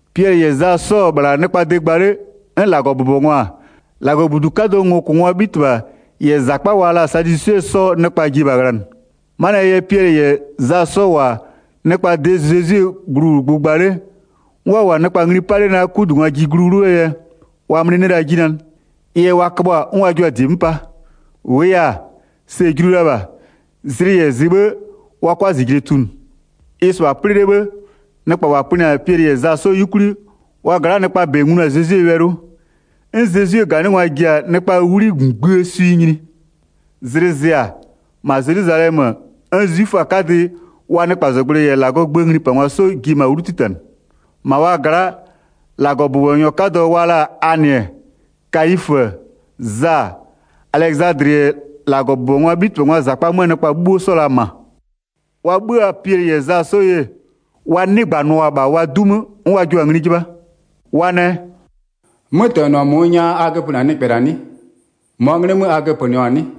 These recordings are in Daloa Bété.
Piɛlɩ -yɛ Za 'sɔ-ɔ -bhla nɩkpaa de gba 'le, 'n -Lagɔbʋbɔngwa-a, -Lagɔbudu 'kadʋɔ ngokʋngwaa 'bhitɩbha -yɛ -zakpa wa la-a Sadwisɩɛ 'sɔɔ nɩkpa ji-e -bha ghlanɩ. 'Manɩɛ yɛ Piɛlɩ -yɛ Za 'sɔ -wʋ-a nɩkpaa de Zezwie gluwlʋgbʋ gba 'le, 'n wa -wʋ-a nɩkpa ngli 'pa 'le naa 'kudungwa ji glu 'wlʋɔ yɛ, wa 'mlɩ 'nɩ la 'ji nanɩ. Ɩ yɛ wa köbhʋa-a 'n wa jua-a -die 'mö 'pa. -Wʋʋ yɛ-a, sɛ-ɛ julu la -bha, zlɩ -yɛ zɩ 'bhë, wa 'kʋa -zijle tunʋ. Ɩ-ɩ -sɩbha 'plɩ 'le 'bhë, nɩkpa -wa pönɩ-a Piɛlɩ -yɛ Za 'sɔ 'yukwli, wa gla'aa nɩkpaa -bɛ nglu-a Zezwie wɛlɩ 'wʋ. 'N Zezwie -ganɩngwa ji-a nɩkpaa 'wli ngbïë swɩ nyini. Zlɩ zɩ-a, -ma Zelwizalɛmö, 'n 'zwiföaa 'kadɩ, wa nɩkpazɔgblʋɩ -yɛ -Lagɔɔ gböö nglipangwa 'sɔ ji-e -ma 'wlu 'titanɩ. 6-Ma wa gla'a, -Lagɔbʋbɔnyɔ 'kadɔ wa la-a Anɩ-ɛ, Kayifö-ö, Za, Alɛzadlɩ -yɛ -Lagɔbʋbɔngwaa 'bhitɩbhangwaa -zakpa 'möö nɩkpa 'bhuo 'sɔ-ɔ la -ma. Wa 'bhö-a Piɛlɩ -yɛ Za 'sɔ ye, wa 'nɩgbanʋa-a -bha wa 'du 'mö, 'n wa jua-a ngli 'jɩbha. Wa nɛ: “'Mötɛnɔ -mʋʋ nya a göpönɩ-a nɩkpɛ -la 'nɩ? -Mɔɔ 'nglɩ 'mö a göpönɩɔ-a 'nɩ?”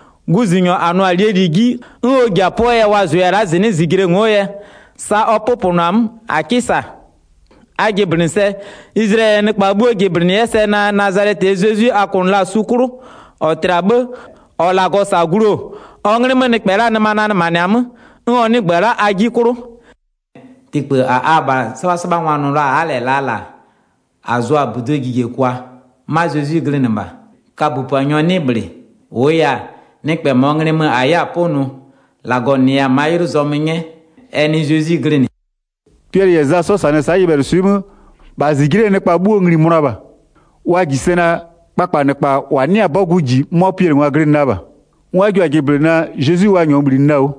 Guzunyɔ -a nʋ-a -lie -li 'ji, 'n ɔ ji-a 'pʋɔ yɛ wa -zʋya-a la'a -zɩnɩ'ɩ -zijle ngo'o yɛ, sa ɔ 'pʋpʋnʋ-a 'mö -a 'kɩ -sa. A jɩblɩnɩ sɛ, Izlayɛlɩɛ nɩkpa 'bhuo jɩblɩnɩ 'yɛ sɛ naa Nazalɛtɩɛ Zezwi a kʋnʋ la-a su 'klʋ, -ɔ tlɩ-a 'bhë, -ɔ -Lagɔ -sa-a glu-o, ɔ 'nglɩ 'mö nɩkpɛ la'aa nɩma nanɩmanɩ-a 'mö, 'n ɔ 'nɩgbö-ö la'a a 'ji 'klʋ. Tikpë -a abha 'sɩbhasɩbhangwa nʋ la-a a'a -lɛ -laa -la, -a zʋ-a -buduo jijekwa-a, 'ma Zezwi glɩnɩ -bha. Kabö -Puanyɔ 'nɩ -bhlɩ, -wʋʋ yɛ-a, nɩkpɛ -mɔɔ nglɩ mö -a 'yɛ-a 'pʋnʋ, -Lagɔ -nɩya-a ma'a 'ylʋ zɔmö 'nyɛ, ɛ nɩ Zezwi glɩnɩ.” Piɛlɩ -yɛ Za 'sɔ -sanɩ-ɛ sa'a nyɩbhɛlʋswɩ'ɩ 'mö, -bha -zijle'ee nɩkpa 'bhuo ngli-i mönʋa -bha. Wa -ji sɛ naa, kpakpanɩkpa -wa 'nɩ-a 'bɔgʋ -ji, 'mʋa Piɛlɩngwa glɩnɩ la -bha. 'N wa jua-a jɩblɩnɩ naa, Zezwi wa -nyɔɔ -bhlinɩ la-a 'wʋ.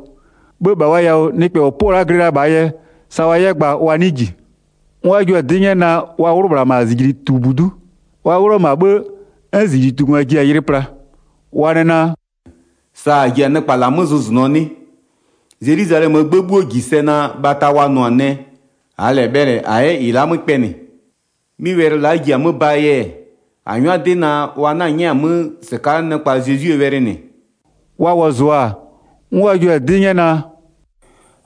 'Bhë -bha wa yawʋ nɩkpɛ -ɔ 'pʋ-ɔ la'a glɩ la -bhaa yɛ, sa wa 'yɛ gba wa 'nɩɩ -ji. 'N wa jua-a 'dɩ 'nyɛ naa, wa 'wlʋ -bhla -ma -zijlitubudu'u. Wa 'wlʋ-ɔ -ma 'bhë 'n -zijlitungwa ji-a yɩlɩ pla. Wa nɛ naa: “Sa -a ji-a nɩkpa -la 'mö zʋzʋnʋɔ 'nɩ? Zelwizalɛmöö 'gbë 'bhuo -ji sɛ naa bhata wa nʋ-a nɛ, -aa -lɛ bhɛlɩ -a 'yɛ -ɩ la'a 'mö kpɛnɩ. 'Mɩ wɛlɩ la'a ji-a 'mö baa yɛ-ɛ, -a 'nyʋa 'dɩ naa wa 'na-a 'nyɛ-a 'mö -sɩka'a nɩkpa Zezwie wɛlɩ -nɩ.” Wa wɔzʋa-a, 'n wa jua-a 'dɩ 'nyɛ naa: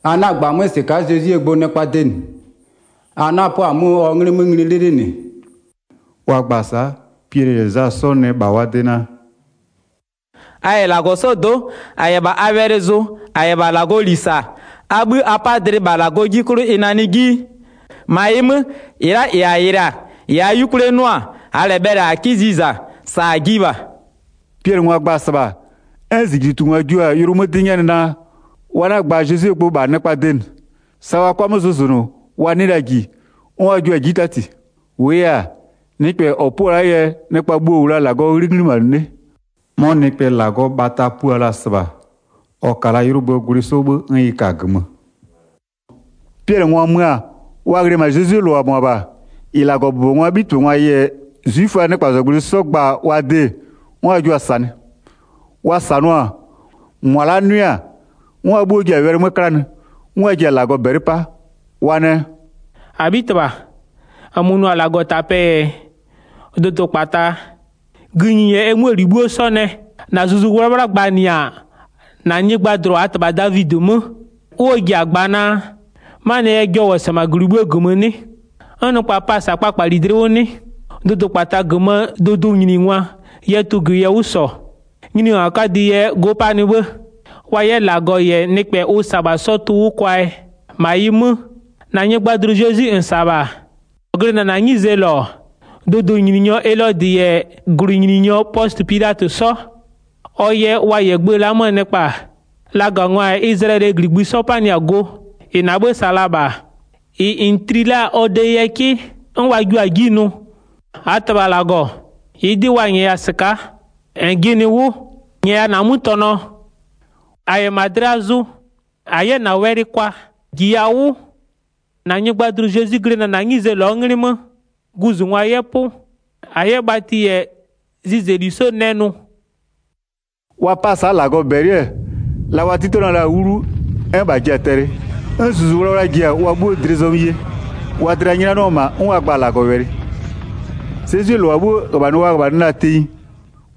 “A 'na-a gba-a 'mö -sɩka'a Zezwie gbʋ nɩkpaa de, a 'na-a 'pʋa-a 'mö ɔ 'nglɩ 'mö ngli 'lɩlɩlɩ -nɩ.” Wa gba-a sa'a, Piɛlɩ -yɛ Za 'sɔ nɛ -bha wa de naa: “A -yɛ -Lagɔ 'sɔɔ do'o, -a -yɛ -bha a wɛlɩ zʋ -a -yɛ -bha -Lagɔɔ -li -sa, a 'bhï a 'pa-a dlɩ -bha -Lagɔ 'ji 'klʋ ɩ nanɩ 'ji? 20-Ma ɩ 'mö, -ɩ la'a -ɩ -a yɩlɩ-a, -ɩ -aa 'yukwlie 'nʋ-a, -aa -lɛ bhɛlɩ -a 'kɩ ziza, -sa -a jiɩ -bha.” Piɛlɩngwa gba-a -sɩbha, 'n -zijlitungwa jua-a yʋlʋ 'mö 'dɩ 'nyɛnɩ naa, wa 'na-a gba Zezwie gbʋ -bha nɩkpaa de -nɩ. Sa wa 'kʋa 'mö zʋzʋnʋ, wa 'nɩ la -ji, 'n wa jua-a 'ji 'tati. -Wʋʋ yɛ-a, nɩkpɛ -ɔ 'pʋ-ɔ la'aa yɛ nɩkpa 'bhuo -wʋ la-a -Lagɔɔ 'nglɩ 'ghlimanɩ 'le. 'Mɔ nɩkpɛ -Lagɔɔ bhata pua la-a -sɩbha, ɔ ka la 'ylʋböö gwlɩ 'sɔ 'bhë 'n ɩ ka-a -gömö. Piɛlɩngwa mö-a, wa ghlɩ-ɛ -ma Zezwie -lʋa -mʋabha, -ɩ -Lagɔbʋbɔngwaa 'bhitɩbhangwa -yɛ 'zwiföaa nɩkpazɔgblʋɩ 'sɔ gba-a wa de 'n wa jua-a -sanɩ. Wa -sanʋa-a, -mʋa la'a 'nʋɩ-a, 'n wa 'bhuo ji-a wɛlɩ 'mö 'klanɩ, 'n wa ji-a -Lagɔ -bɛlɩ 'pa. Wa nɛ: “-Abhitɩbha, -nmö nʋ-a -Lagɔtapɛ-ɛ, dʋdʋkpata, gïnyi -yɛ ɛ 'möö -li 'bhuo 'sɔ nɛ. 25-Na Zuzu 'Wlawla gbanɩ-a -na nyɩgbajʋlʋ -aa -tɩbha Davidɩ 'mö, 'n ɔ ji-a gba naa: 'Manɩɛ yɛ jɔ -wʋ-ɔ -sa-a -ma -gwlɩ 'bhuoo -gömö, 'n nɩkpa pa-a -sa-a kpakpali dlɩ 'wʋ 'nɩ? Dʋdʋkpata -gömöö dʋdʋnyiningwa yɛ tʋgwɩ yɛ 'wʋ -sɔ, nyiningwa 'kadɩ yɛ go 'panɩ 'bhë, wa 'yɛ -Lagɔ -yɛ nɩkpɛ ʋ -sa-a -bha 'sɔ tʋ 'wʋ kwaa yɛ. 27-Ma ɩ 'mö, -na nyɩgbajʋlʋ Zezwi -n -sa-a -bha, -ɔ glɩnɩ-ɛ -na 'nyizee -lɔ, dʋdʋnyininyɔ Elodɩ -yɛ -gwlɩnyininyɔ Pɔsɩ Pilatɩ 'sɔ, ɔ yɛ wa -yɛ gbë la'a 'möö nɩkpa-a, lagangwa -yɛ Izlayɛlɩɛ -gligbï 'bhuo 'sɔ 'panɩ-a go. 28-Ɩ -na 'bhë -sa la-a -bha, -ɩ -n tli la-a ɔ de yɛ 'kɩ, 'n wa jio-a 'ji nʋ. 29-Aa -Tɩbha -Lagɔ, -ɩɩ 'dɩ wa -nyɛya-a -sɩka'a, -nyɛya -na 'mötɛnɔ, -a 'yɛ -ma dlɩa zʋ, -a 'yɛ -na wɛlɩ kwa. 30-Jiya 'wʋ, -na nyɩgbajʋlʋ Zezwi-i glɩnɩ-ɛ -na 'nyizee -lɔɔ 'nglɩ 'mö, guzungwa 'yɛ 'pʋ, -a 'yɛ bhatɩ -yɛ zɩzɛli 'sɔ nɛ nʋ.” 31Wa 'pa-a sa'a -Lagɔ -bɛlɩ-ɛ, la wa 'titanɩɔ la-a 'wlu, 'n -bha ji-a tɛlɩ, 'n Zuzu 'Wlawla ji-a wa 'bhuo dlɩ zɔmö ye wa dlɩ-a 'nyʋnanɩɔ-ɔ -ma 'n wa gba-a -Lagɔwɛlɩ. Sa Zezwie -lʋa 'slonʋ-a wa -li 'bhuo 'wʋ 32Zezwie -lʋa 'bhuo -ghöbhanɩ wa -ghöbhanɩ la-a tenyi,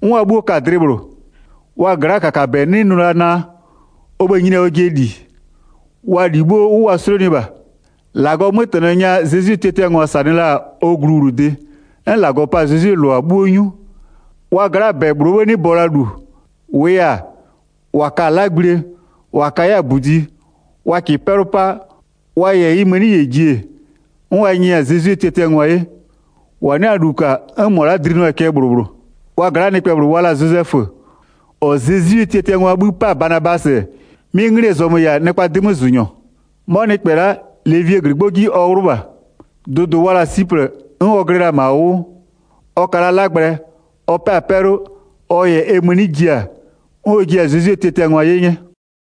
'n wa 'bhuo ka-a dlɩ -bhlʋ. Wa gla'aa -kakabɛ 'nɩ nʋ la naa, ɔ bhë-ë nyini-a ɔjɩɛ -li, wa -li 'bhuo 'wʋ wa 'slonʋɩ -bha. 33-Lagɔɔ 'mötɛnɔ nya Zezwie tiatiangwa -sanɩ la-a ɔ gluwlʋdɩ, 'n -Lagɔ pa-a Zezwie -lʋa 'bhuo 'nyu. 34Wa gla'aa -bɛ -bhlʋɔ 'bhë 'nɩ bɔ la -lu. -Wʋʋ yɛ-a, -wa ka-a 'lagblie, -wa ka 'yɛ-a -budi, wa -kɩɩ 'pɛlʋ 'pa, wa -yɛ ɩ mëni -yɛ ji-e, 35'n wa nyɛɛ-a Zezwie tiatiangwa 'ye, -wa 'nɩ-a -lu -ka 'n -mʋa la'a dlinʋa-a cɛ -bhlʋ -bhlʋ. 36Wa gla'aa nɩkpɛ -bhlʋ wa la-a Zozɛfö, -ɔ Zezwie tiatiangwaa 'bhï 'pa-a Banabasɩ, 'mɩ 'nglɩɛ zɔmö -yɛ-a nɩkpaa 'dɩmözʋnyɔ. 'Mɔ nɩkpɛ la'a, Levie -glɩgbɔ 'ji ɔ 'wlʋ -bha. Dʋdʋ wa la-a Siplɩ, 'n ɔ glɩ la-a -ma ʋ 'wʋ. 37Ɔ ka la 'lagblɛ, ɔ 'pɛ-a 'pɛlʋ, ɔ -yɛ ɛ mëni ji-a, 'n ɔ jiɛ-a Zezwie tiatiangwa 'ye 'nyɛ.